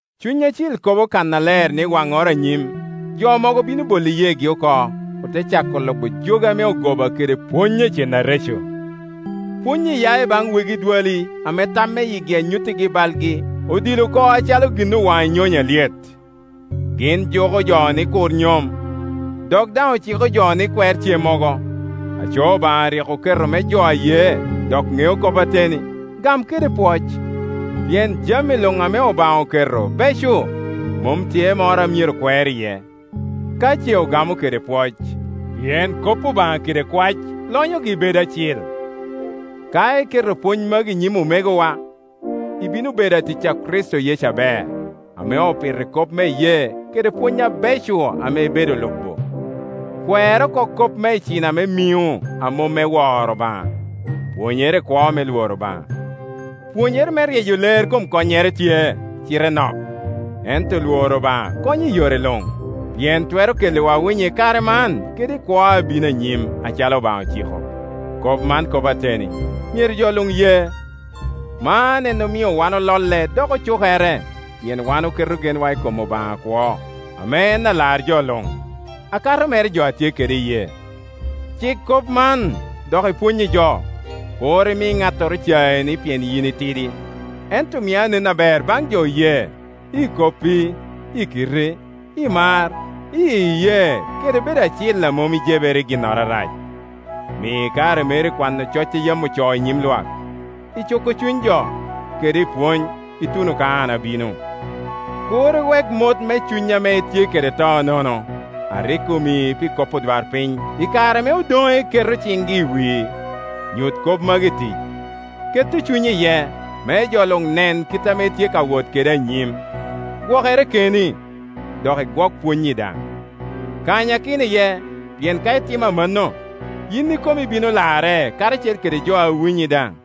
Cuny Acil kobo kannaler ni waŋŋoro anyim, jo mogo bino bolo iyeegi oko, ote cako lubo jogi ame ogoba kede pwony a cen areco. Pwony-nyi ya i baŋ wegi edwali ame tam me yigi a nyuttigi balgi odil oko acalo gin owaŋo i nyonyo alyet. Gin juko jo ni kur nyom, dok daŋ ociko jo ni kwer cemmogo; aco Obaŋa rik oketo me jo a ye dok ŋeo kop ateni, gam kede pwoc. Pien jami luŋ ame Obaŋa oketo beco, mom tye moro a myero kwer iye, ka ce ogamo kede pwoc; pien kop Obaŋa kede kwac lonyogi bedo acil. Ka iketo pwony magi i nyim omegowa, ibino bedo atic a Kricito Yecu aber, ame opito i kop me iyee kede pwony abeco ame ibedo lubo. Kwer oko kop me icina me miŋo a mom me lworo Obaŋa. Pwonyere i kwo me lworo Obaŋa. Pwonyere me ryeyo ler kom konnyere tye, cite nok; ento lworo Obaŋa konyo i yore luŋ, pien twero kelliwa winyo i kare man kede i kwo a bino anyim acalo Obaŋa ociko. Kop man kop ateni, myero jo luŋ ye. Man en omio wan ololle dok ocukere, pien wan oketo genwa i kom Obaŋa akwo, ame en Alar jo luŋ, akato mere jo a tye kede iyee. Cik kop man, dok ipwony i jo. Kur imi ŋattoro cai ni pien yin itidi, ento mi anen aber baŋ jo oye, i koppi, i kitti, i mar, i iyee kede bedo acil a mom ijebere i ginnoro arac. Mi kare meri i kwano coc a yam ocoo i nyim lwak, i cuko cuny jo, kede i pwony, ituno ka an abino. Kur iwek mot me cuny ame itye kede to nono, a rik omii pi kop odwarpiny i kare ame odoŋe keto ciŋgi i wii. Nyut kop magi i tic, ketto cunyi iye, me jo luŋ nen kit ame itye ka wot kede anyim. Gwokere keni, dok igwok pwonnyi daŋ; kanyakino iye, pien ka itimo amanno, yin ikomi ibino larre karacel kede jo a winyi daŋ.